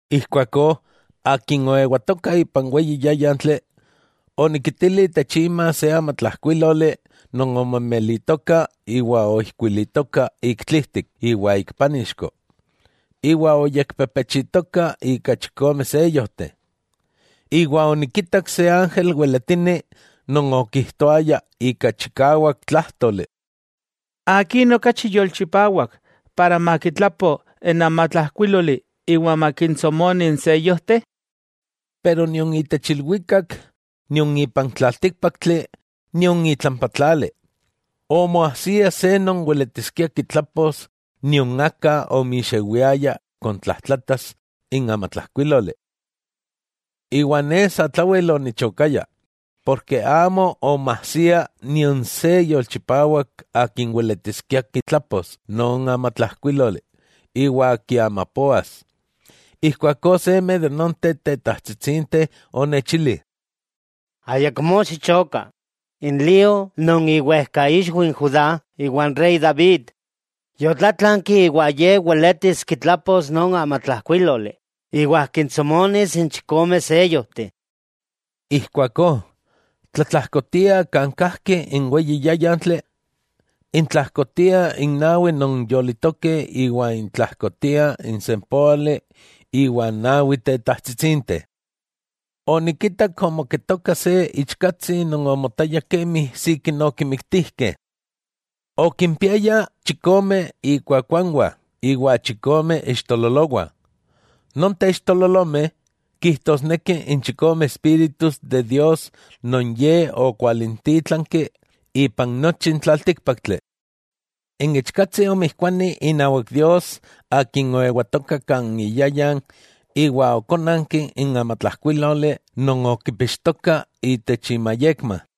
Ijkuakó, akin oewatoka ipan weyi yáyantli, onikitili itech ima se amatlajkuíloli non omemelitoka iwa oijkuilitoka ik tlijtik iwa ik pánixko, iwa oyekpepechitoka ika chikome seyojteh. Iwa onikitak se ángel weletini non okijtoaya ika chikawak tlájtoli: —¿Akin okachi yolchipawak makitlapo n amatlajkuíloli iwa makintsomoni n seyojteh? Pero nion itech ilwikak nion ipan tlaltíkpaktli nion itlampa tlali, omoajsia se non weletiskia kitlapos nion aka omixewiaya kontlajtlatas n amatlajkuíloli. Iwa ne satlawel onichokaya, porke amo omoajsia nion se yolchipawak akin weletiskia kitlapos non amatlajkuíloli iwa kiamapoas. Ijkuakó seme de nonteh tetajtsitsinteh onechili: —Ayakmó xichoka, n lío non iwejkaixwi n Judá iwa n rey David, yotlátlanki iwa Ye weletis kitlapos non amatlajkuíloli iwa kintsomonis n chikome seyojteh. Ijkuakó, tlatlajkotia kan kajki n weyi yáyantli, intlajkotiah n nawi non yolitokeh iwa intlajkotiaj n sempóali iwa n nawi tetajtsitsinteh. Onikitak omoketoka se Ichkatsi non omotaya kemi sikin okimiktijkeh. Okimpiaya chikome ikuakuanwah iwa chikome ixtololowah; nonteh ixtololomeh kijtosnekih n chikome espíritus de Dios non Ye okwalintítlanki ipan nochi n tlaltíkpaktli. N Ichkatsi omijkuani inawak Dios Akin oewatoka kan iyayan iwa okónanki n amatlajkuíloli non okipixtoka itech imayekma.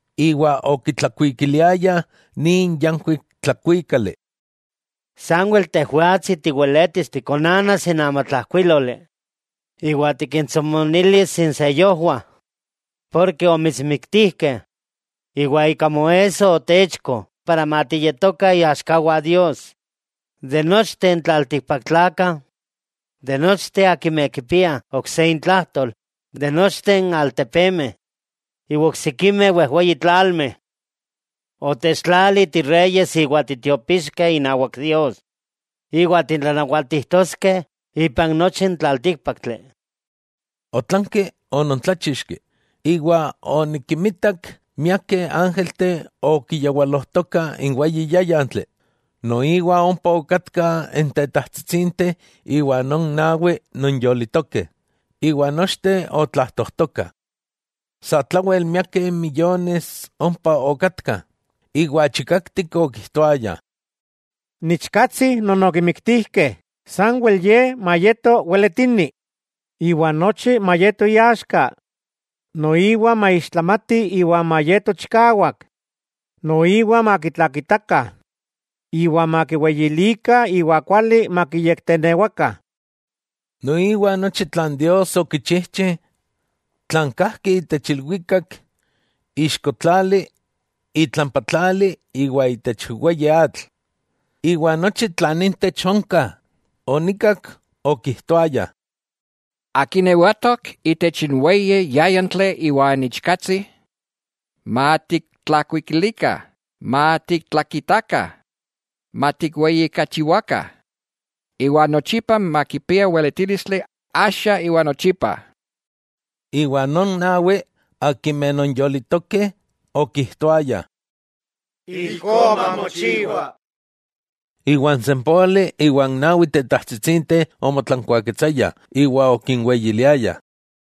Iwa okitlakuikiliayah nin yankuik tlakuíkali: Sanwel Tejwatsi tiweletis tikonanas n amatlajkuíloli iwa tikintsomonilis iseyojwah; ken omitsmiktijkeh, iwa ika moesso otechko para matiyetokah iaxkawah Dios, itech nochteh n tlaltikpaktlakah, itech nochteh akimeh kipiah ok se intlajtol, itech nochteh n altepemeh iwa oksikimeh wejweyi tlalmeh. Otechtlali tireyes iwa titiopixkeh inawak Dios, iwa titlanawatijtoskeh ipan nochi n tlaltíkpaktli. Otlanki onontláchixki, iwa onikinmitak miakeh ángelteh okiyawalojtokah n weyi yáyantli, noiwa ompa okatkah n tetajtsitsinteh iwa non nawi non yolitokeh, iwa nochteh otlajtojtokah. Satlawel miakeh miyomeh ompa okatkah, iwa chikaktik okijtoayah: ¡N Ichkatsi non okimiktijkeh sanwel Ye mayeto weletini, iwa nochi mayeto iaxka, noiwa maixtlamati iwa mayeto chikawak, noiwa makitlakitakah, iwa makiweyilikah iwa kuali makiyektenewakah! Noiwa nochi tlan Dios okichijchi, tlan kajki itech ilwikak, ixko tlali, itlampa tlali iwa itech weyi atl, iwa nochi tlan intech onka, onikak okijtoayah: ¡Akin ewatok itech n weyi yáyantli iwa n Ichkatsi, matiktlakuikilikah, matiktlakitakah, matikweyijkachiwakah, iwa nochipa makipia weletílistli, axa, iwa nochipa! Iwa non nawi, non yolitokeh, okijtoayah: —¡Ijkó mamochiwa! Iwa n sempóali iwa n nawi tetajtsitsinteh omotlankuaketsayah iwa okiweyiliayah.